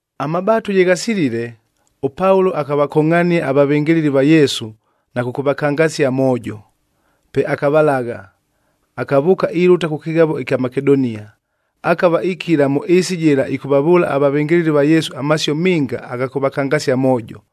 Amabaatu ye ghasilile, ʉPaulo akavakongʼhania avavɨngɨlɨli va Yesu na kʉkʉvakangasia amoojo. Pe akavalagha, akavʉʉka ilʉta kʉ kɨghavo ɨkya Makedonia. Akava ikila mʉ ɨɨsi jɨla ɨkʉvavʉʉla avavɨngɨlɨli va Yesu amasio minga agha kʉvakangasia amoojo.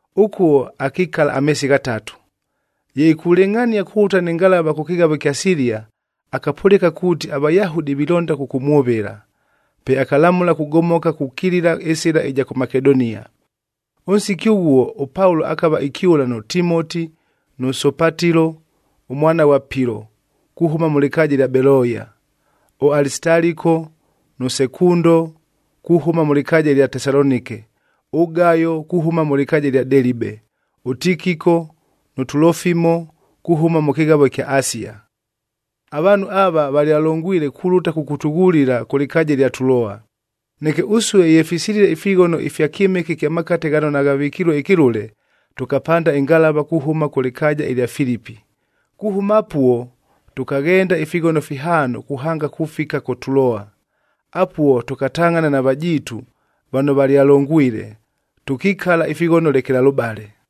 Ʉkuo akikala ameesi ghatatu. Ye ikulɨngʼhania kulʉta nɨ ngalava kʉ kɨghavob ɨkya Silia, akapʉlɨka kuuti aVayahudi vilonda kʉkʉmwʉvɨla. Pe akalamʉla kugomoka na kukilila ɨsɨla ɨja kʉ Makedonia. Ʉnsiki ʉghuo ʉPaulo akava ikyʉla nʉ Timoti, nʉ Sopatilo, ʉmwana ghwa Pilo kuhʉma mʉ lɨkaaja ɨlya Beloya, ʉAlisitaliko nʉ Sekundo kuhʉma mʉ lɨkaaja ɨlya Tesalonike, ʉGayo kuhʉma mʉ lɨkaaja ɨlya Delibe, ʉTikiko nʉ Tulofimo kuhʉma mʉ kɨghavo ɨkya Asia. Avaanhu ava valyalongwile kulʉta kʉkʉtʉghulila kʉ lɨkaaja ɨlya Tuloa. Neke ʉsue ye fisilile ifighono ifya kyɨmɨke ɨkya makate ghano naghavɨkilue ɨkɨlʉle, tʉkapanda ɨngalava kuhʉma kʉ lɨkaaja ɨlya Filipi. Kuhʉma apuo, tʉkaghenda ifighono fihaano kuhanga kufika kʉ Tuloa. Apuo tʉkatangʼhana na vajiitu vano valyalongwile, tʉkikala ifighono lekelalʉbale.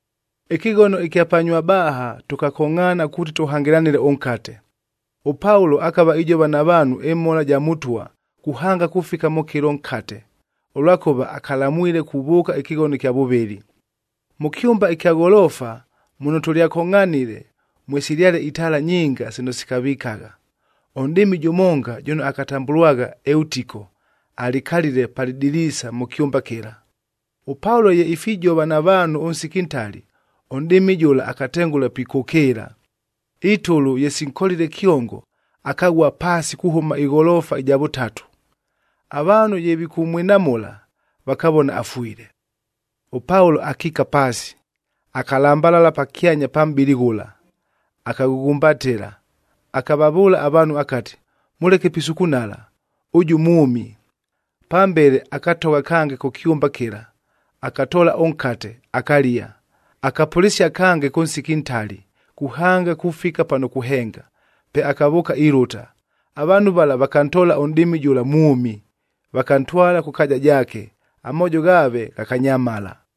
Ɨkɨghono ɨkya pa Nywabaahac tʉkakongʼhaana kuuti tʉhangɨlanɨle ʉnkate.d ɄPaulo akava ijova na vaanhu ɨmhola ɨja Mʉtwa, kuhanga kufika mʉ kɨlo nkate, ʉlwakʉva akalamwile kuvʉʉka ɨkɨghono ɨkya vʉvɨlɨ. Mʉ kyʉmba ɨkya gholoofa muno tʉlyakongʼhanile, mwesilyale itaala nyinga sino sikavikagha. Ʉnʼdɨɨmi jʉmonga jʉno akatambʉlwagha Eutiko alikalile pa lɨdiliisa mʉ kyʉmba kɨla. ɄPaulo ye ifijova na vaanhu ʉnsiki ntali, ʉnʼdɨɨmi jʉla akatengʉla pikʉkɨɨla. Itʉlʉ ye sinkolile kyongo, akaghua paasi kuhʉma ɨgholoofa ɨja vʉtatu. Avaanhu ye vikʉmwinamʉla, vakavona afwile. ɄPaulo akiika paasi, akalambalala pakyanya pa mʼbɨlɨ ghʉla, akaghʉghumbatɨla, akavavʉʉla avaanhu akati, “Mʉleke pisukunala, ʉjʉ mwʉmi!” Pambele akatogha kange kʉ kyʉmba kɨla, akatoola ʉnkate, akalia. Akapʉlɨsia kange kʉ nsiki ntali kuhanga kufika pano kuhenga, pe akavʉʉka ilʉta. Avaanhu vala vakantoola ʉnʼdɨɨmi jʉla mwʉmi, vakantwala kʉ kaaja jaake, amoojo ghaave ghakanyamala.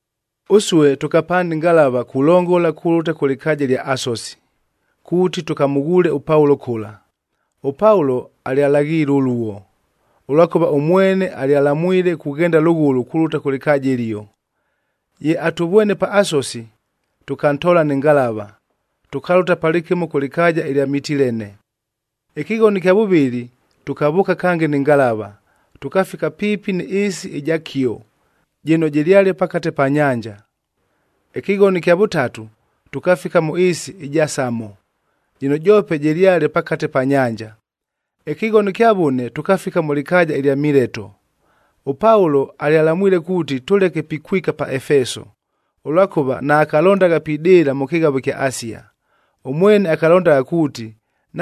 Ʉsue tʉkapanda ɨngalava kulongola kulʉta kʉ lɨkaaja ɨlya Asosi, kuuti tʉkamʉghuule ʉPaulo kʉla. ɄPaulo alyalaghiile ʉluo, ʉlwakʉva ʉmwene alyalamwile kughenda lʉghʉlʉ kulʉta kʉ lɨkaaja ɨlio. Ye atʉvwene pa Asosi, tʉkantoola nɨ ngalava, tʉkalʉta palɨkɨmo kʉ lɨkaaja ɨlya Mitilene. Ɨkɨghono ɨkya vʉvɨlɨ, tʉkavʉʉka kange nɨ ngalava, tʉkafika piipi nɨ ɨɨsi ɨja Kio jɨno jɨlyale pakate pa nyanja. Ɨkɨghono ɨkya vʉtatu, tʉkafika mʉ ɨɨsi ɨja Samo jɨno joope jɨlyale pakate pa nyanja. Ɨkɨghono ɨkya vʉne, tʉkafika mʉ lɨkaaja ɨlya Mileto. ɄPaulo alyalamwile kuuti tʉleke pikwika pa Efeso, ʉlwakʉva naakalondagha pidɨɨla mʉ kɨghavo ɨkya Asia. Ʉmwene akalondagha kuuti,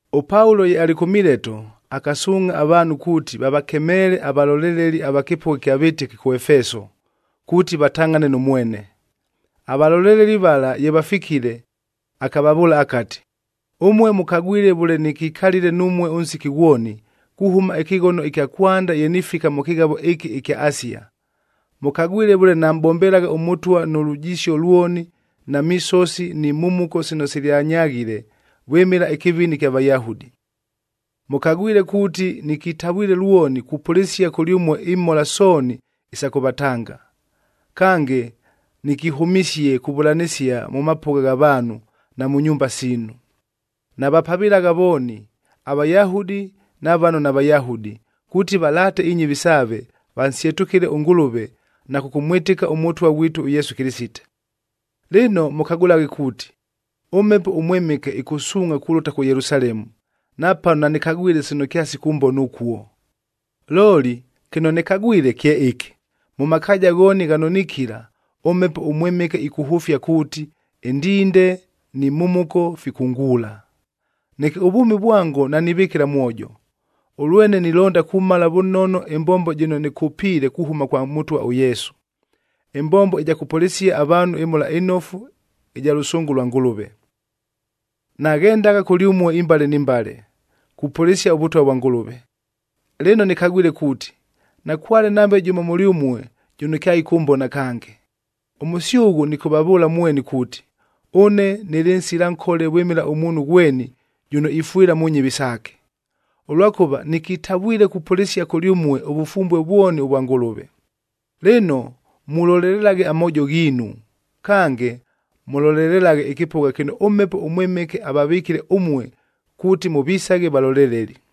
ɄPaulo ye alɨ kʉ Mileto, akasuungʼha avaanhu kuuti vavakemeele avaloleleli ava kɨpʉgha ɨkya vɨtɨki kʉ Efeso, kuuti vatangʼhane nʉ mwene. Avaloleleli vala ye vafikile, akavavʉʉla akati, “Ʉmue mʉkagwile vʉle nɨkikalile numue ʉnsiki ghwoni, kuhʉma ɨkɨghono ɨkya kwanda ye nifika mʉ kɨghavo ɨkɨ ɨkya Asia. Mʉkagwile vʉle namʼbombelagha ʉMʉtwa nʉ lujisio lwoni, na misosi ni mhumuko sino silyanyaghile vwɨmɨla ɨkɨvini ɨkya Vayahudi. Mʉkagwile kuuti, nɨkitavwile lwoni kupʉlɨsia kʉlyʉmue imhola sooni isa kʉvatanga. Kange, nɨkihʉmisie kuvʉlanɨsia mʉ mapʉgha gha vaanhu, na mʉ nyumba siinu. Navapavɨlagha vooni, aVayahudi na vano naVayahudi, kuuti valaate inyɨvi saave, vansyetʉkɨle ʉNgʉlʉve na kʉkʉmwɨtɨka ʉMʉtwa ghwitu ʉYesu Kɨlɨsite. “Lɨno, mʉkagʉlaghe kuuti, ʉMhepo ʉMwɨmɨke ɨkʉsuungʼha kulʉta kʉ Yelusalemu, napano nanɨkagwile sino kyasikʉmbona ʉkuo. Looli kɨno nɨkagwile kye ɨkɨ: Mʉ makaaja ghooni ghano nikila, ʉMhepo ʉMwɨmɨke ɨkʉhʉfia kuuti, ɨndinde ni mhumuko fikʉnguula. Neke ʉvwʉmi vwango nanivɨkɨla mwojo, ʉlwene nilonda kumala vʉnono ɨmbombo jɨno nɨkʉpiile kuhʉma kwa Mʉtwa ʉYesu, ɨmbombo ɨja kʉpʉlɨsia avaanhu ɨMhola ɨNofu ɨja lʉsʉngʉ lwa Ngʉlʉve. “Naghendagha kʉlyʉmue imbale ni mbale, kupʉlɨsia ʉVʉtwa vwa Ngʉlʉve. Lɨno, nɨkagwile kuuti, nakwale nambe jʉmo mʉlyʉmue jʉno kyaɨkʉmbona kange. Ʉmʉsyʉghʉ nɨkʉvavʉʉla mweni kuuti, ʉne nɨlɨ nsila nkole vwɨmɨla ʉmuunhu ghweni jʉno ifwɨla mʉ nyɨvi saake, ʉlwakʉva nɨkitavwile kupʉlɨsia kʉlyʉmue ʉvʉfumbue vwoni ʉvwa Ngʉlʉve. Lɨno, mulolelelaghe amoojo ghiinu, kange mʉlolelelaghe ɨkɨpʉgha kɨno ʉMhepo ʉMwɨmɨke avavɨkile ʉmue kuuti mʉvisaghe valoleleli.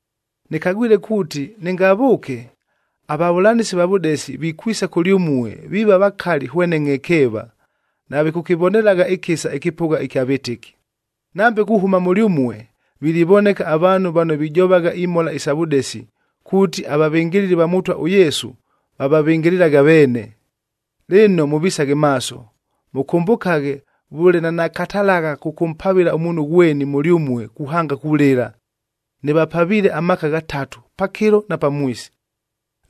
Nɨkagwile kuuti nɨngavʉʉke, avavʉlanɨsi va vʉdesi vikwisa kʉlyʉmue viiva vakali hwene ngʼhekeeva, navikʉkɨvonelagha ɨkɨsa ɨkɨpʉgha ɨkya vɨtɨki. Nambe kuhʉma mʉlyʉmue, vilivoneka avaanhu vano vijovagha imhola isa vʉdesi, kuuti avavɨngɨlɨli va Mʉtwa ʉYesu, vavavɨngɨlɨlaghe aveene. Lɨno, mʉvisaghe maaso! Mʉkʉmbʉkaghe vʉle nanakatalagha kʉkʉmpavɨla ʉmuunhu ghweni mʉlyʉmue kuhanga kulɨla. Nɨvapaviile amaaka ghatatu, pakɨlo na pamwisi.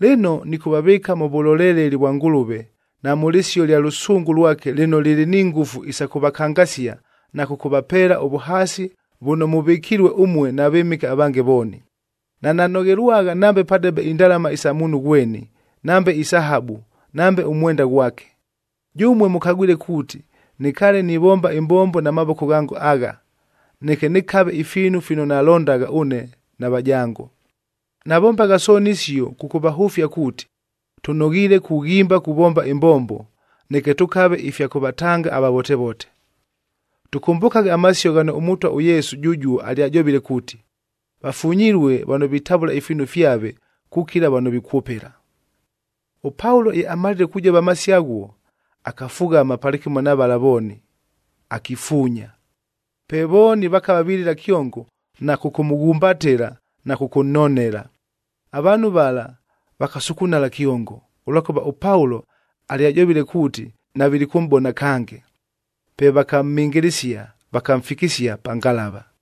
“Lɨno, nɨkʉvavɨɨka mʉ vʉloleleli vwa Ngʉlʉve na mʉ lɨsio ɨlya lʉsʉngʉ lwake lɨno lɨlɨ ni ngʉfu isa kʉvakangasia na kʉkʉvapeela ʉvʉhaasi vʉno mʉvɨkilue ʉmue na vɨmɨke avange vooni. Nananoghelwagha nambe padebe indalama isa muunhu ghweni, nambe isahabu nambe ʉmwenda ghwake. Jʉmue mʉkagwile kuuti, nɨkaale nivomba ɨmbombo na mavoko ghango agha, neke nɨkave ifiinu fino nalondagha ʉne na vajango. Navombagha sooni isio kʉkʉvahʉfia kuuti, tʉnoghiile kughimba kuvomba ɨmbombo, neke tʉkave ifya kʉvatanga avavotevote. Tʉkʉmbʉkaghe amasio ghano ʉMʉtwa ʉYesu jʉjuo alyajovile kuuti, ‘Vafunyilue vano vitavʉla ifiinu fyave kukila vano vikwʉpɨla.’” ɄPaulo ye amalile kujova amasio aghuo, akafughama palɨkɨmo na vala vooni, akifuunya. Pe vooni vakava vilɨla kyongo na kʉkʉmʉghumbatɨla na kʉkʉnnonela. Avaanhu vala vakasukunala kyongo, ʉlwakʉva ʉPaulo alyajovile kuuti navilikʉmʼbona kange. Pe vakamhɨngɨlɨsia, vakamfikisia pa ngalava.